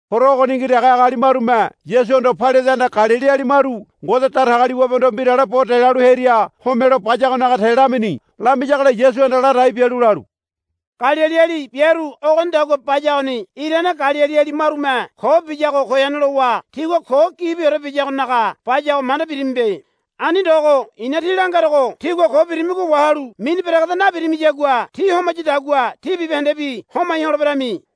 Horo ogoningi dege agali marume Yasuhondo Pailatehanda Galiliali maru Ngode Datagaliwabehondo mbirale bo delalu hearia homelo bayagonaga te lamini. Lamiyagola Yasuhanda ladai bialu lalu, Galiliali biaru ogonidagua bayagoni irane Galiliali marume ko biyago goyane lowa tigua ko gibiore biyagonaga bayago manda birimibe. Ani ndogo i̱na tí langerogo tígua ko birimigo wahalu mini beregeda nabirimiyagua ti homayadagua tí bibahendebi homai holeberami.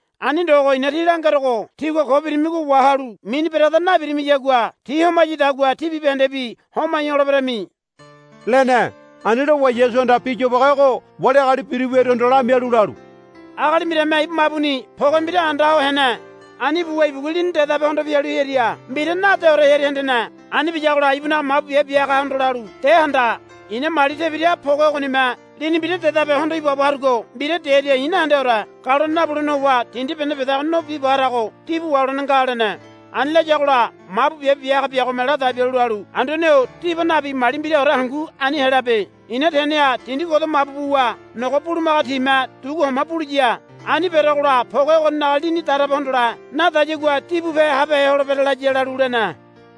Ani ndogo i̱na tí langerogo tígua ko birimigo wahalu mini beregeda nabirimiyagua ti homayadagua tí bibahendebi homai holeberami, lene. Ani lowa Yasuhanda bi yobage ogo wali agali biru wiaruhondo lamialu lalu, Agali mbirame ibu mabuni poge mbira anda ho hene. Ani buwa ibugua lini dedabe hondo pialu hearia mbira nadeore hearia hendene. Ani biyagola ibunaga mabu biabe bia hagahondo lalu, De handa. I̱na mali tebira poge ogonime lini mbira dedabe hondo ibaabo harugo mbira dearia i̱ nahendeore. Galone nabulene howa dindi bene bedago no biba harago dibu waholene nga, lene. Ani layagola mabu biabe bia haga biagome ladai bialu lalu, Anduane-o diba nabi mali mbiraore hangu ani helabe. I̱na teneha dindi godo mabu buwa nogo bulumaga time dugu homa buliya. Ani berogola poge ogoninaga lini darabe hondole nadagayagua dibupe habehe holebere, laya, lalu lene.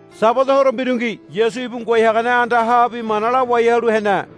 Sabada horo mbirungi Yasu ibu ngoai hagane andahabi mana lawai halu hene.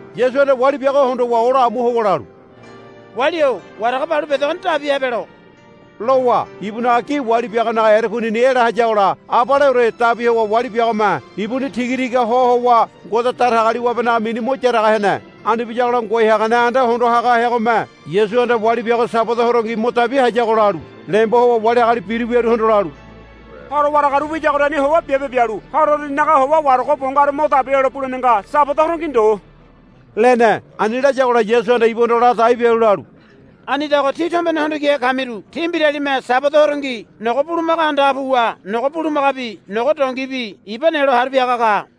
Yasuhanda wali biago hondowa ola amu howa lalu, Wali-o warago balu bedegoni dabi habelo, lowa ibunaga gi wali biagonaga erekunini ela hayagola abaleore dabi howa wali biagome ibuni tigatiga ho howa Ngode Datagaliwabenaga mini mo yaraga hene. Ani biyagola ngoai hagane anda hondo haga heagome, Yasuhanda wali biago Sabada horongi mo dabi hayago, lalu lembo howa wali agali biru wiaruhondo lalu, Horo waragaru wiyagoriani howa biabe bialu horo uruninaga howa warago bo ngaru mo dabi helo ibulene nga Sabada horongi ndo, lene. Ani layagola Yasuhanda ibuhondo ladai bialu lalu, Anidago tí tombene hondo kihe kamiru tí mbiralime Sabada horongi nogo bulumaga andaha puwa nogo bulumagabi nogo dongibi iba nelo haru piaga ka.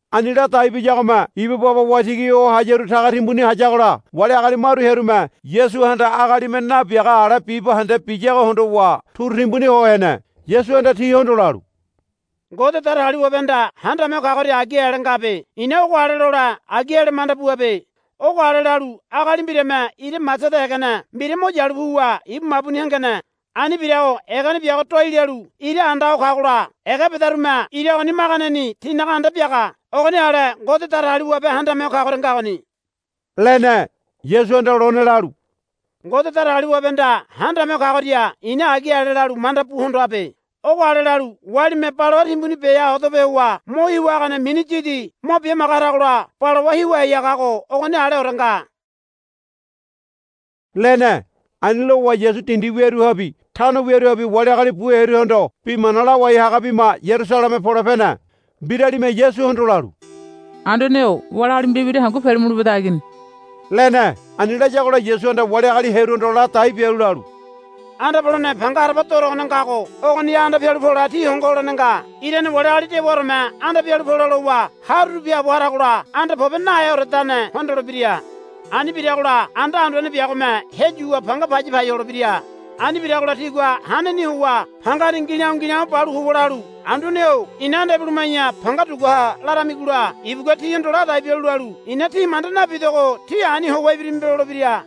Ani ladai biyagome ibu baba waitigi ho hayaru taga timbuni hayagola wali agali maru hearume Yasuhanda agalime nabiaga ale bibahende biyago hondowa turu timbuni ho hene. Yasuhanda tihondo lalu, Ngode Datagaliwabehanda Handame Ho Kagoria agi ale ngabe. I̱na ogo ale lole agi ale lalu manda buabe. Ogo ale lalu agali mbirame ira masada egene mbira mo yalu puwa ibu mabuni hengene. Ani birago egene biago doai lalu ira anda ho kagola ega bedarume ira ogoni maganeni tinaga anda biaga. Ogoni ale Ngode Datagaliwabe Handame Ho Kagoria ngagoni, lene. Yasuhanda lone lalu, Ngode Datagaliwabehanda Handame Ho Kagoria i̱na agi ale lalu manda bu hondoabe. Ogo ale lalu walime balawa timbuni beha odape howa mo hiwa hagane mini yidi mo bimaga haragola balawa hiwa hai hagago ogoni aleore nga, lene. Ani lowa Yasu dindi wiaruhabi tano wiaruhabi wali agali bu hearuhondo bi mana lawai haga bima Yarusaleme pole pene. Mbiralime Yasuhondo lalu, Anduane-o wali agali mbira mbira hangu pele mule beda agini, lene. Ani layagola Yasuhanda wali agali hearuhondo ladai bialu lalu, Anda polene panga haraba dorogone ngago ogoniha anda pialu pole tí hongo holene nga. Irane wali agali dewaoreme anda pialu pole lowa haruru biaabo haragola anda pobe naheoredane hondolebira. Ani biragola anda anduane biagome heyuwa panga paya pai holebira. Ani biragola tígua haneni howa pangani ngi̱la̱o̱ ngi̱la̱o̱ balu howa lalu, Anduane-o ina anda ibuluma̱ya panga dugua ha, laramigola ibugua tíhondo ladai bialu lalu, I̱na tí manda nabidogo tí ani howa ibirimibe, lolebira.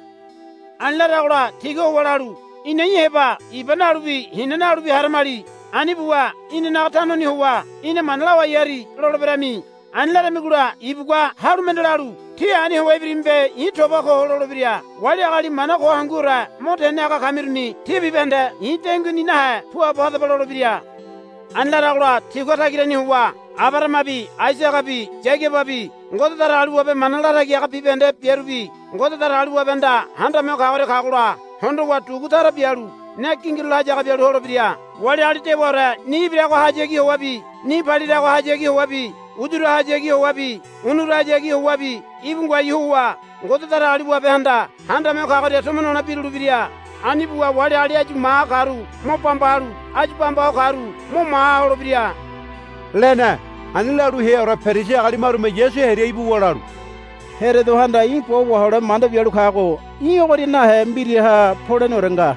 Ani laragola tígua howa lalu, Ina í̠ heba iba nalubi hina nalubi haramali. Ani buwa inanaga tanoni howa í̠na mana lawai hari, loleberami. Ani laramigola ibugua halu mende lalu, Tí ani howa ibirimibe i̱ toba ko, lolebira. Wali agali mana ko hanguore mo tene haga kamiruni tí bibahende i̱ denguini nahe puabo hadaba, lolebira. Ani laragola tígua tagirani howa Abarahamabi Aisagabi Yagababi Ngode Datagaliwabe mana latagi haga bibahende biarubi Ngode Datagaliwabehanda Handame Ho Kagoria kagola hondowa dugu tara bialu ne gingirulo hayaga bialu holebira. Wali agali dewaore ni ibiragohayagi howabi ni paliragohayagi howabi uyurahayagi howabi unurahayagi howabi íbu ngoai howa Ngode Datagaliwabehanda Handame Ho Kagoria tomo nole birulebira. Ani buwa wali agali áyu maha karu mo bamba halu áyu bamba ho karu mo maha holebira, lene. Ani lalu heaore Perisi agali marume Yasu hearia ibuwa lalu, Herodohanda í̠ bo wahole manda bialu kago í̠ ogoria nahe mbiraha poleneore nga,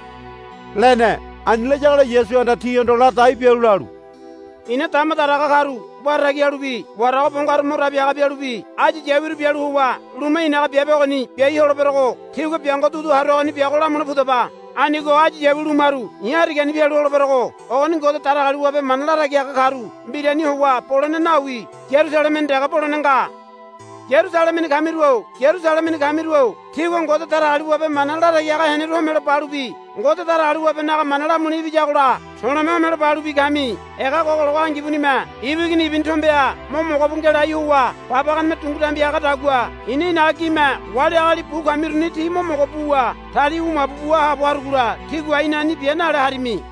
lene. Ani layagola Yasuhanda tihondo ladai bialu lalu, I̱na dama daraga karu wara tagi halubi warago bo ngaru mo dabi haga bialubi áyu yawiru bialu howa luma i̱naga biabe ogoni biai holeberogo tígua biango dudu haruagoni biago lamule pudaba. Anigo áyu yawi lumaru i̱ harigani pialu holeberogo ogoni Ngode Datagaliwabe mana latagi haga karu mbirani howa bolene nawi Yarusalemeni dege bolene nga. Yarusalemeni kamiru-o Yarusalemeni kamiru-o tígua Ngode Datagaliwabe mana latagi haga heneru homelo balubi Ngode Datagaliwabenaga mana lamule ibiyagola to̱le̱me homelo balubi kami. Ega gogologo angibunime ibu igini ibuni tombeha mo mogo bu ngelai howa babaganeme dungu dambi hagadagua i̱na i̱naga gime wali agali bu kamiruni tí mo mogo buwa tali wu mabu bua haabo harugola tígua, Í̠na ani bia, nale harimi.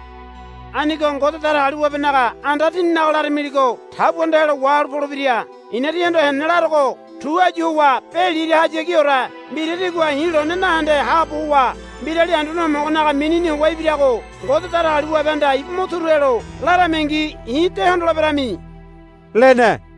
Anigo Ngode Datagaliwabenaga anda tíninaga laramiligo tabuanda helo wahalu polebira. I̱na tíhondo henene larogo tu áyu howa be lirahayagiore mbira tígua i̱ lone nahende haabo howa, Mbirali Anduane Homogonaga minini howa ibirago Ngode Datagaliwabehanda ibu mo turu helo, laramingi i̱ de hondoleberami, lene.